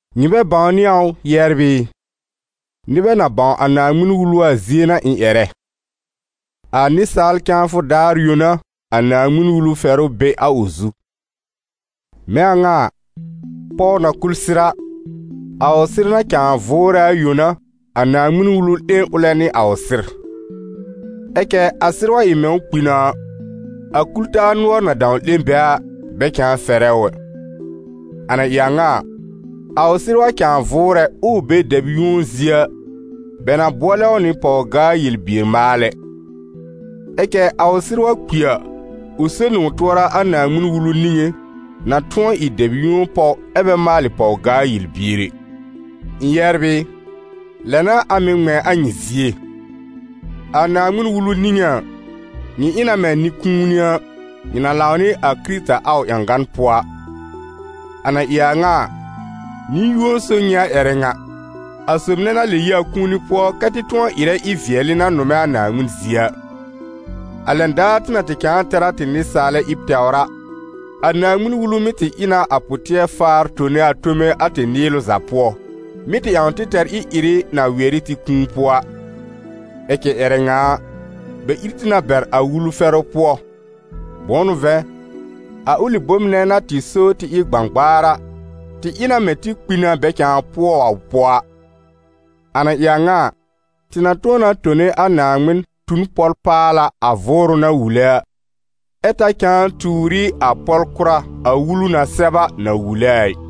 Nyɩ bɛ bãwnɩ a ʋ, yɛbr ɩ? Nɩbɛ na bãw a Naaŋmɩn-Wulu a zie n'a ɩ̃ ƴɛrɛ: a nɩsaal cãafʋ daar yõ n'a, a Naaŋmɩn-Wulu fɛrʋ be a ʋ zu. Mɛ̃ a ŋa a, pɔw na kul sɩr a, a ʋ sɩr na cãa vʋʋrɛ a yõ n'a, a Naaŋmɩn-Wulu 'lẽ ʋlɛ nɩ a ʋ sɩr; ɛ cɛ a sɩr wa ɩ mɛ̃ ʋ kpi na a, a kul-taa nʋɔr na dãw 'lẽ bɛ a, bɛ cãa fɛrɛ ʋ ɛ. A na ɩ a ŋa a, a ʋ sɩr wa cãa vʋʋrɛ, ʋʋ be dɛb yũo zie a, bɛ na bʋɔlɛ ʋ nɩ pɔw-gaa- yel-bier-maalɛ; ɛ cɛ a ʋ sɩr wa kpi a, ʋ so nɩ ʋ tʋɔra a Naaŋmɩn-Wulu niŋé, na tʋ̃ɔ ɩ dɛb yũo pɔw ɛ bɛ maalɩ pɔw-gaa-yel-bier ɛ. Ɩ̃ yɛbr ɩ, lɛ n'a a mɩ̀ ŋmɛ̃ a nyɩ zie. A Naaŋmɩn-Wulu niŋé a, nyɩ ɩ na mɛ̃ nɩ-kũuni a, nyɩ na lãw nɩ a Kɩrɩta a ʋ ƴãgan pʋɔ a. A na ɩ a ŋa a, nɩ-yũo so nyɩ a ƴɛrɛ ŋa, a sob nɛ na lɛb yi a kũuni pʋɔ kɛ́ tɩ tʋ̃ɔ ɩrɛ ɩ-vɩɛlɩ na nʋmɛ a Naaŋmɩn zie a. A lɛn daar tɩ na tɩ cãa tɛr a tɩ nɩsaalɛ ɩb tɛwr a, a Naaŋmɩn-Wulu mɩ́ tɩ ɩ na a pʋ-tɩɛr-faar tone a tome a tɩ nɩɩlʋ za pʋɔ, mɩ́ tɩ ƴãw tɩ tɛr ɩ-ɩrɩ na wɩɛr ɩ tɩ kũu pʋɔ a. Ɛ cɛ ƴɛrɛ ŋa a, bɛ ír tɩ na bɛr a Wulu fɛrʋ pʋɔ; bʋ̃ʋ n'ʋ vɛ̃, a ʋlɩ bom nɛ na tɩ so tɩ ɩ gbãgbaar a, tɩ ɩ na mɛ̃ tɩ kpi na bɛ cãa pʋɔ ʋ pʋɔ a. A na ɩ a ŋa a, tɩ na tʋ̃ɔ na tone a Naaŋmɩn tu n pɔl-paala a Vʋʋrʋ na wule a, ɛ ta cãa tuur ɩ a pɔl-kʋra a Wulu na sɛb a na wule a ɩ.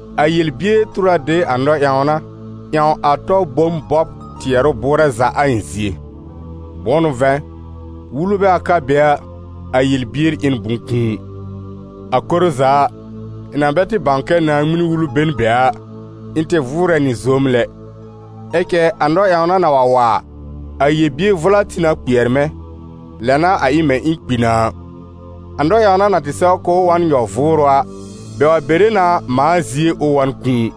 A yel-bier tur a de a nɔ-ƴãwna, ƴãw a tɔ bom bɔb tɩɛrʋ bʋʋrɛ za a ɩ̃ zie. Bʋ̃ʋ n'ʋ vɛ̃, Wulu bɛ wa ka be a, a yel-bier ɩ n bʋ̃-kũu. A koro za a, ɩ̃ na bɛ tɩ bãw kɛ Naaŋmɩn-Wulu be n be a, ɩ̃ tɩ vʋʋrɛ nɩ zoom lɛ; ɛ cɛ a nɔ-ƴãwna na wa wa a, a yel-bier vʋla tĩ na kpɩɛr mɛ̃, lɛ n'a a ɩ mɛ̃ ɩ̃ kpi na a. A nɔ-ƴãwna na tɩ sɛw k'ʋʋ wa n nyɔ-vʋʋrʋ a, bɛ wa bere na mãa zie ʋ wa n kũu.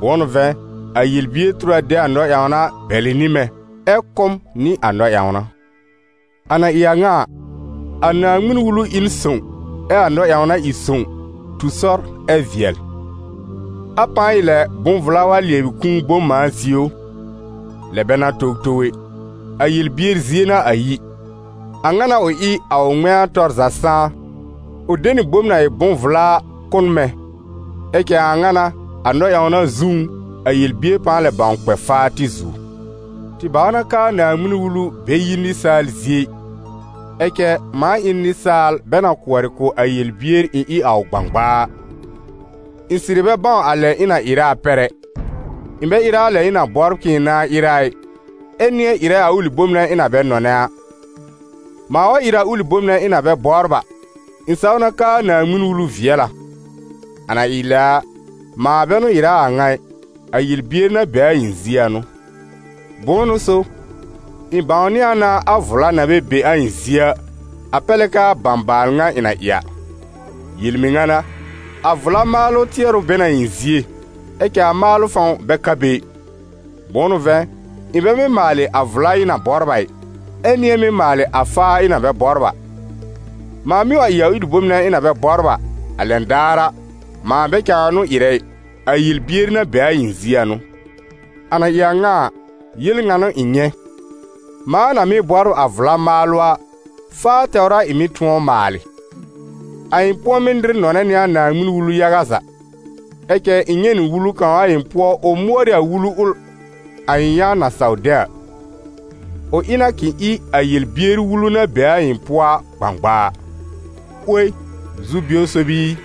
Bʋ̃ʋ n'ʋ vɛ̃, a yel-bier tur a de a nɔ-ƴãwna bɛlɩ nɩ mɛ̃, ɛ kʋ́ m nɩ a nɔ-ƴãwna. A na ɩ a ŋa a, a Naaŋmɩn-Wulu ɩ n sõw ɛ a nɔ-ƴãwna ɩ sõw, tu sɔr ɛ vɩɛl. A pãa ɩ lɛ bʋ̃-vla wa lɩɛbɩ kũu bom mãa zie ʋ? Lɛ bɛ n'a towtow ɛ! A yel-bier zie n'a a yi. A ŋa n'a ʋ ɩ, a ʋ ŋmɛ̃a tɔr za sãá: ʋ de nɩ bom na ɩ bʋ̃-vla a kʋ́ n mɛ̃. Ɛ cɛ a a ŋa n'a, a nɔ-ƴãwna zũú, a yel-bier pãa lɛ bãw kpɛ faa tɩ zuo. Tɩ bãw na k'aa Naaŋmɩn-Wulu bɛ yi nɩsaal zie ɩ; ɛ cɛ mãa ɩ n nɩsaal bɛ na kʋɔrɩ kʋ̀ a yel-bier ɩ̃ ɩ a ʋ gbãgbaa a. Ɩ̃ sɩrɩ bɛ bãw a lɛ ɩ̃ na ɩrɛ a pɛr ɛ: ɩ̃ bɛ ɩrɛ a lɛ ɩ̃ na bɔbr k'ɩ̃ɩ nãa ɩrɛ a ɩ, ɛ nɩ̃ɛ ɩrɛ a ʋlɩ bom nɛ ɩ̃ na bɛ nɔnɛ a. Mãa wa ɩrɛ a ʋlɩ bom nɛ ɩ̃ na bɛ bɔbr a, ɩ̃ saw na k'aa Naaŋmɩn-Wulu vɩɛl a. A na ɩ lɛ a, mãa bɛ n'ʋ ɩrɛ a a ŋa ɩ, a yel-bier na be a ɩ̃ zie a n'ʋ. Bʋ̃ʋ n'ʋ so, ɩ̃ bãwnɩ a na a vla na bɛ be a ɩ̃ zie a, a pɛr lɛ k'aa bãbaal ŋa ɩ̃ na ɩ a. Yel-mɩŋa n'a, a vla maalʋ tɩɛrʋ be n a ɩ̃ zie, ɛ cɛ a maalʋ fãw bɛ ka be ɩ. Bʋ̃ʋ n'ʋ vɛ̃, ɩ̃ bɛ mɩ́ maalɩ a vla ɩ̃ na bɔbr a ɩ, ɛ nɩ̃ɛ mɩ́ maalɩ a faa ɩ̃ na bɛ bɔbr a. Mãa mɩ́ wa ɩ a ʋlɩ bom nɛ ɩ̃ na bɛ bɔbr a, a lɛn daar a, mãa bɛ cãa n'ʋ mɩ́ ɩrɛ ɩ, a yel-bier na be a ɩ̃ zie a n'ʋ. A na ɩ a ŋa a, yel ŋa n'ʋ ɩ̃ nyɛ̃: mãa na mɩ́ bɔbr a vla maalʋ a, faa tɛwr a ɩ̃ mɩ́ tʋ̃ɔ maalɩ. A ɩ̃ pʋ̃ɔmɩ́ nɩr nɔnɛ nɩ a Naaŋmɩn-Wulu yaga za. Ɛ cɛ ɩ̃ nyɛ̃ nɩ wulu kãw a ɩ̃ pʋɔ ʋ mʋɔr ɩ a Wulu ʋl a ɩ̃ yã na saw de a. Ʋ ɩ na k'ɩ̃ ɩ a yel-bier wulu na be a ɩ̃ pʋɔ a gbãgbaa. 'Woi, zu-bio sob i!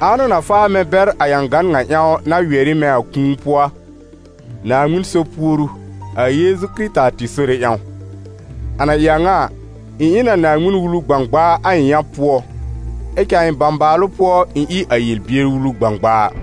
Ãa n'ʋ na faa mɛ̃ bɛr a ƴãgan ŋa ƴãw, na wɩɛr ɩ mɛ̃ a kũu pʋɔ a? Naaŋmɩn so puoru, a Yeezu Kɩrɩta tɩ Sore ƴãw! A na ɩ a ŋa a, ɩ̃ ɩ n a Naaŋmɩn-Wulu gbãgbaa a ɩ̃ yã pʋɔ, ɛ cɛ a ɩ̃ bãbaalʋ pʋɔ, ɩ̃ ɩ a yel-bier wulu gbãgbaa.